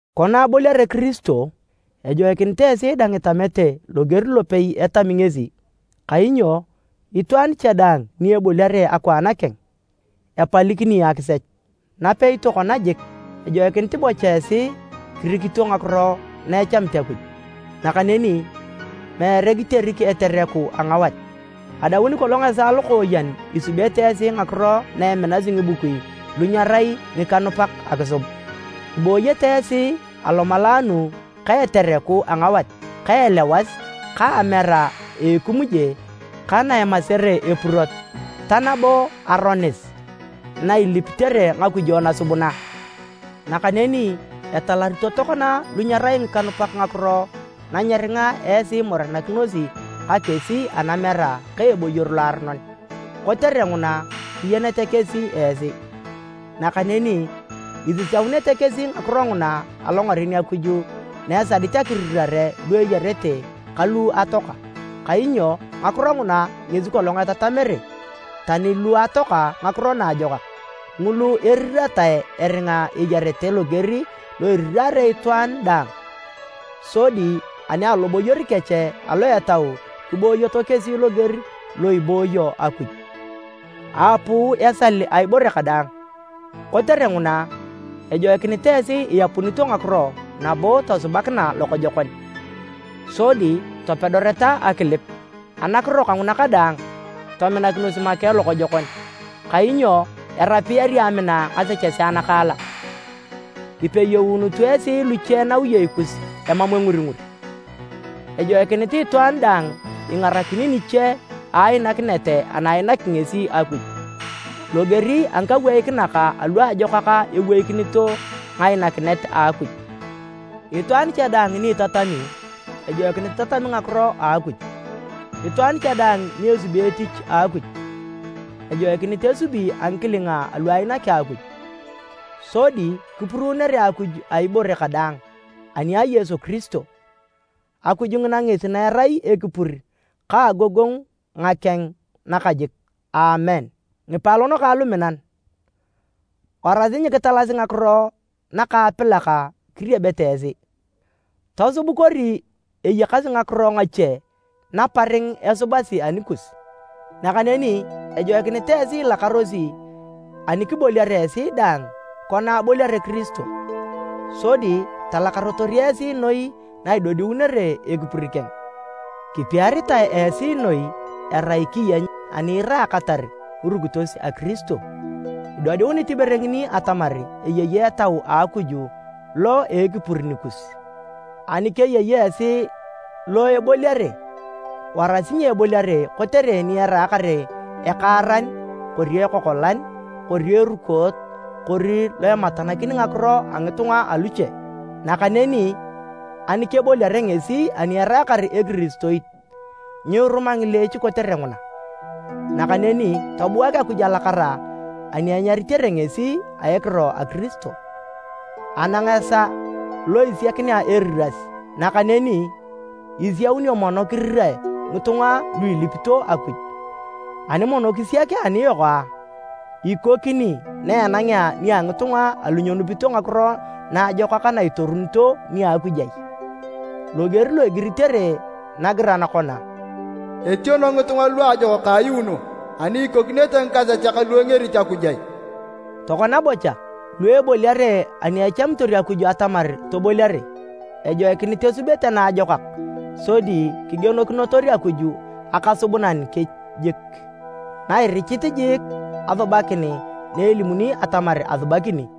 Kona aboliare Kirisio, ejoikinit esi dang itamete loger lopei etami ngesi, kainyo itwaan cha daang ni eboliare akwaan keng, epalikini akisech. Napei tokona jik, ejoikinit bocha esi kirikito ngakiro na echamit Akuj, nakaneni meere kiterik etereku a ngawat. Adaun kolong esaa lokooyen isubete esi ngakiro na eminasi ngibukui lu nyerai ngikanupak akisub. Ibooyete esi alomalaanu ka etereku a ngawat ka elewas ka amera a ekimuje ka na emasere epurot, ta nabo aronis na ilipitere ngakujo nasubuna. Nakaneni etalarito tokona lu nyerai ngikanupak ngakiro na nyeringa esi imorenakinosi ka kesi anamera ka eboyor loaronon, kotere nguna kiyenyete kesi esi. Nakaneni isisaunete kesi ngakiro nguna alongaren Akuj na esadit akirirare lu eyarete ka lu atoaka. Kainyo ngakiro nguna ngesi kolong etatamere tani lu atoaka Ngakiro Naajokak, ngulu eriratae eringa eyarete loger lo iriraare itwaan daang, sodi ani aloboyor kech alo etau kiboyoto kesi loger lo ibooyo Akuj. Aapuu esal a ibore kadaang. Kotere nguna, ejoikinit esi iyapunito ngakiro nabo tosubakina lokojokon, sodi topedoreta akilip. Anakiro kanguna kadaang, tominakinos make lokojokon, kainyo erapiyari amina ngasechesea nakaalak. Kipeyounutu esi luche nawiyei kus emam enguringur. Ejoikinit itwaan daang ingarakini niche a ainakinet ana ainaki ngesi Akuj, loger a ngikaweikinak alu ajokak eweikinito ngainakinet a Akuj. Itwaan cha daang ni itatami, ejoikinit itatami ngakiro a Akuj, itwaan cha daang ni esubi etich a Akuj, ejoikinit esubi a ngikilinga alu ainaki Akuj, sodi kipuruunoe Akuj a ibore kadaang, ani a Yesu Kiristo. Akuj ngina ngesi na erai ekipur ka agogongu ngakeng nakajik. Aamen. Ngipaalon kang luminan, warasi nyikitalasi ngakiro nakaapilak kiriebete esi, tosub kori eyakasi ngakiro ngache naparing esubasi anikus. Nakaneni ejoikinit ilakarosi ani kiboliare esi dang kona aboliare Kiristo, sodi talakarotor esi noi na idodiunere ekipur keng. Kipiaritae esi noi erai kiyeny ani iraakatar ngirukitos a Kiristo, idodiunit ibore ngini atamar eyei Etau a Akuj lo a ekipur nikus. Ani keyei esi lo eboliare, warasi nyeboliare kotere ni eraakar ekaaran kori ekokolan kori erukoot kori lo ematanakin ngakiro a ngitunga aluche. Nakaneni ani keboliare ngesi ani eraakar ekiristoit, nyiruma ngileech kotere nguna, nakaneni tobuak Akuj alakara ani enyaritere ngesi a ekiro a Kiristo. Anang esaa lo isiakinea eriras, nakaneni isiaunio mono kirirae ngitunga lu ilipito Akuj. Ani mono kisiak aniyok a, ikokini na enangea nia ngitunga alu nyenupito Ngakiro Naajokak na itorunito nia Akuj ai? Loger lo igiritere nagiran kona, “Etiono ngitunga luajokak ayuuno, ani ikokinete ngikasechak lu engerito Akuj ai?” Tokona bocha, lu eboliare ani echamitor Akuj atamar toboliare, ejoikinit esubete naajokak sodi kigienokinotor Akuj Akasubunan kech jik, na irichit jiik asubakin na elimuni atamar asubakini.